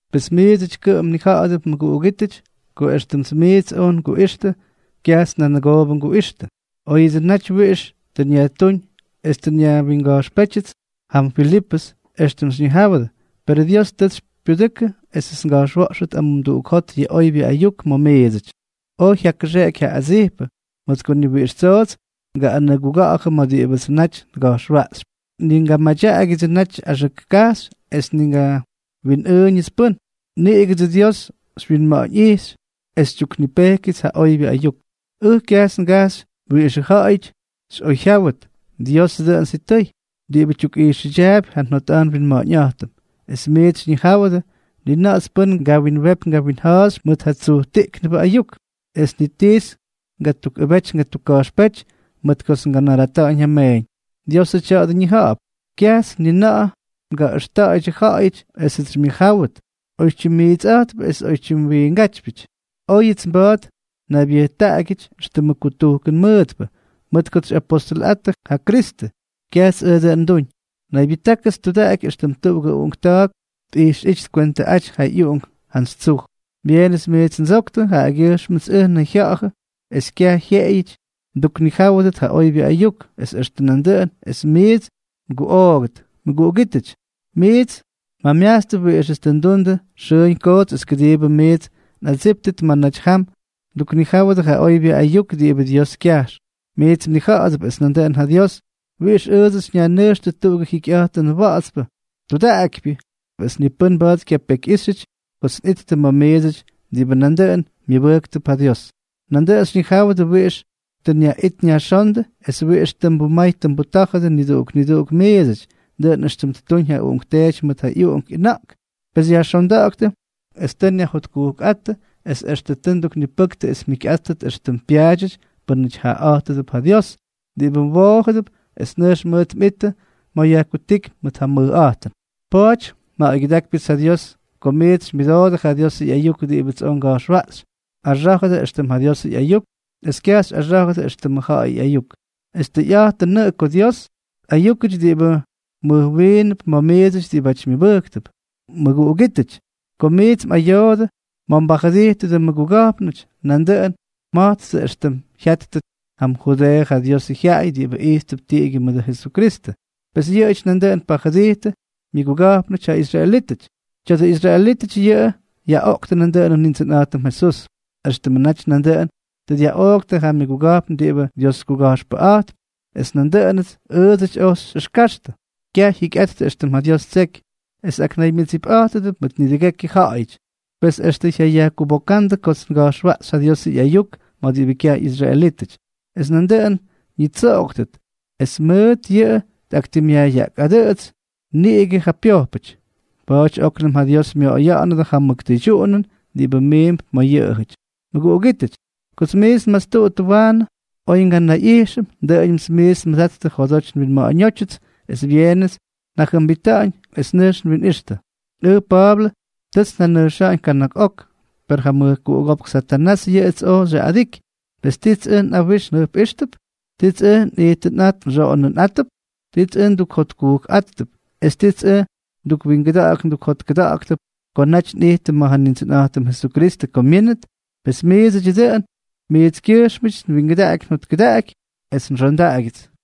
Pes miidsʉty kʉꞌʉm mnija̱ꞌa̱dʉp mʉguꞌugítʉty, ko éxtʉmts miits oj nguꞌixtʉ, kyajts nanʉgoobʉ nguꞌixtʉ. Oyʉts naty wiꞌix tʉ nyajtúñ es tʉ nyajwinga̱jxpétyʉty jam Filipʉs, éxtʉm xyñijáwʉdʉ, perʉ Dios tʉts xypyudʉkʉ esʉts nga̱jxwa̱ꞌxʉt amumduꞌuk jot yʉ oybyʉ ayuk ma̱ miidsʉty, oy jyakʉxeꞌeky ja adsijpʉ. Mʉt ko ni wiꞌix tsoots ngaꞌꞌanʉguga̱ꞌa̱jʉ ma̱ diꞌibʉdsʉ naty nga̱jxwaꞌxypy, ni ngamadyaꞌagyʉdsʉ natyʉ axʉk kajxy es ni ngawinꞌʉʉna̱ꞌa̱ñʉts pʉ́n. Niꞌigʉdsʉ Dios xywyinma̱ꞌa̱ñꞌijxy es xytyuknipejkyʉts ja oybyʉ ayuk. Ʉj kyajts ngajxy wiꞌixʉ ja̱ꞌa̱yʉts xyꞌoyjyáwʉt, Diosʉ dʉꞌʉn sitʉy, diꞌibʉ tyukꞌijxʉdyaapy ja njotꞌa̱jt nwinma̱ꞌa̱ñꞌa̱jtʉm. Extʉm miits xyñijáwʉdʉ, ni na̱ꞌa̱ts pʉ́n ngawinwepy ngawinja̱a̱xy mʉt ja tsujtiꞌknʉbʉ ayuk, es ni tits ngatukꞌʉbety ngatukka̱jxpéty mʉt kots nganarata̱ꞌa̱ñ ja meeñ. Diosʉ tya̱a̱dʉ ñija̱ꞌa̱p. Kyajts ni na̱ꞌa̱ ngaꞌʉxta̱ꞌa̱ydyʉ ja̱ꞌa̱yʉty esʉts xymyʉjjáwʉt, oy tyimmiitsꞌa̱jtpʉ es oytyim wiingatyꞌa̱jtpʉ. Oyʉts mba̱a̱t njanaybyʉjtaꞌagyʉdyʉts éxtʉmʉ kutujkʉn mʉʉtpʉ, mʉt kots xyꞌapostʉlʉꞌattʉ ja Kristʉ, kyajts ʉj dʉꞌʉn nduuñ. Naybyʉjtákʉts tudaꞌaky éxtʉm tuꞌugʉ uꞌunkta̱a̱k tꞌijxꞌíty tkwentʉꞌaty ja ꞌyuꞌunk jantsy tsuj. Byeenʉts miits ndsoktʉ, jaꞌagyʉjxmʉts ʉj nnayjya̱ꞌa̱jʉ es kyaj jyeꞌeyʉty nduknijáwʉdʉt ja oybyʉ ayuk, es extʉ nandʉꞌʉn es miits nguꞌoogʉdʉt. Mʉguꞌugítʉty, miits mjamyajtstʉp wiꞌixʉts tʉ ndundʉ xʉʉñ koots es kʉdiibʉ miits nꞌadsíptʉt ma̱ naty jam nduknijáwʉdʉ ja oybyʉ ayuk diꞌibʉ Dios kyajx. Miits mnija̱ꞌa̱dʉp, es nandʉꞌʉn ja Dios, wiꞌix ʉʉdsʉty dyajnʉjxtʉ tuꞌugʉ jikyꞌa̱jtʉnʉ wa̱ꞌa̱tspʉ, tudaꞌakypyʉ es ni pʉ́n mba̱a̱t xykyapekyꞌíxyʉty kots nꞌijttʉ ma̱ miidsʉty diꞌibʉ nandʉꞌʉn myʉbʉjktʉp ja Dios. Nandʉꞌʉn xyñijáwʉdʉ wiꞌix tʉ nyaꞌit nyajxóndʉ es wiꞌix tʉ nbumay nbutá̱jʉdʉ niduꞌuk niduꞌuk miidsʉty, dʉꞌʉn éxtʉm ttuñ ja uꞌunkteety mʉt ja ꞌyuꞌunk ꞌyʉna̱ꞌk. Pes tʉ nyajxonda̱ꞌa̱ktʉ es tʉ nyajjotkujkꞌáttʉ, es extʉ tʉ nduknipʉktʉ es mjikyꞌáttʉt éxtʉm pyaadyʉty pʉ́nʉty jaꞌaꞌa̱jtʉdʉp ja Dios, diꞌibʉ mwoojʉdʉp es nʉjx mʉʉt mꞌittʉ ma̱ yajkutíky mʉt ja mʉjꞌa̱jtʉn. Pa̱a̱ty nja̱ꞌa̱ygyʉdaktiibyʉts ja Dios ko miits xymyʉdoodʉ ja Diosʉ ꞌyayuk diꞌibʉts oj nga̱jxwaꞌxy, mꞌaxá̱jʉdʉ éxtʉm ja Diosʉ ꞌyayuk, es kyaj xyꞌaxá̱jʉdʉ éxtʉmʉ ja̱ꞌa̱yʉ ꞌyayuk. Es tʉyꞌa̱jtʉnʉꞌʉ ko Dios tꞌayúkʉty diꞌibʉ mʉjwiinʉp ma̱ miidsʉty diꞌibáty myʉbʉjktʉp. Mʉguꞌugítʉty, ko miits mꞌayoodʉ ma̱ mbajʉdijtʉdʉ mmʉguga̱jpnʉty, nandʉꞌʉn mja̱jttʉ éxtʉm jya̱jttʉ jam Judeeʉ ja Diosʉ jyaꞌay diꞌibʉ ijttʉp tiꞌigyʉ mʉdʉ Jesukristʉ. Pes yʉꞌʉjʉty nandʉꞌʉn pajʉdijtʉdʉ myʉguga̱jpnʉty, ja israelítʉty. Tya̱dʉ israelítʉty yʉꞌʉ yaꞌoꞌktʉ nandʉꞌʉnʉ Nindsʉnꞌa̱jtʉm Jesús, éxtʉmʉ naty nandʉꞌʉn tʉ dyaꞌooktʉ ja myʉguga̱jpn diꞌibʉ Dioskuga̱jxpʉꞌa̱jttʉ, es nandʉꞌʉnʉts ʉʉdsʉty ojts xyꞌʉxkaxtʉ. Kyaj jyikyꞌattʉ éxtʉm ja Dios ttseky, es aknaymyʉdsipꞌa̱jtʉdʉp mʉt nidʉgekyʉ ja̱ꞌa̱yʉty, pes extʉ jyayajkubokándʉ kots nga̱jxwaꞌxy ja Diosʉ ꞌyayuk ma̱ diꞌibʉ kyaj ꞌyisraelítʉty, es nandʉꞌʉn ñitsoꞌoktʉt. Es mʉt yʉꞌʉ tꞌaktimꞌyajꞌyaꞌkꞌadʉꞌtsypy niꞌigʉ ja pyojpʉty. Pa̱a̱ty óknʉm ja Dios myoꞌoya̱ꞌa̱nʉdʉ ja mʉk tʉydyuꞌunʉn diꞌibʉ miimp ma̱ yʉꞌʉjʉty. Mʉguꞌugítʉty, kots miits nmastuttʉ waanʉ, oy nganayꞌijxʉm, dʉꞌʉñʉmts miits nmʉdattʉ njodoty nwinma̱ꞌa̱ñótyʉts, es byeenʉts njajʉmbita̱ꞌa̱ñ es nʉjx nwinꞌixtʉ. Ʉj Pa̱a̱blʉ, tʉts njanʉjxa̱ꞌa̱ñ kana̱k ok, per ja mʉjkuꞌugópk Satanás yʉꞌʉts oj xyaꞌꞌadiky. Pes ¿tits ʉj nꞌawijx njʉjpꞌijxtʉp?, ¿tits ʉj nꞌijtʉnꞌa̱jt nxoꞌonʉnꞌa̱jttʉp?, ¿tits ʉj ndukjotkujkꞌa̱jttʉp?, es ¿tits ʉj ndukwingʉdak ndukjotkʉdáktʉp ko naty nꞌijtʉm ma̱ ja Nindsʉnꞌa̱jtʉm Jesukristʉ ko myínʉt? Pes miidsʉdyʉ dʉꞌʉn. Miitskyʉjxmʉty nwingʉdaꞌaky njotkʉdaꞌaky es nxondaꞌagyʉts.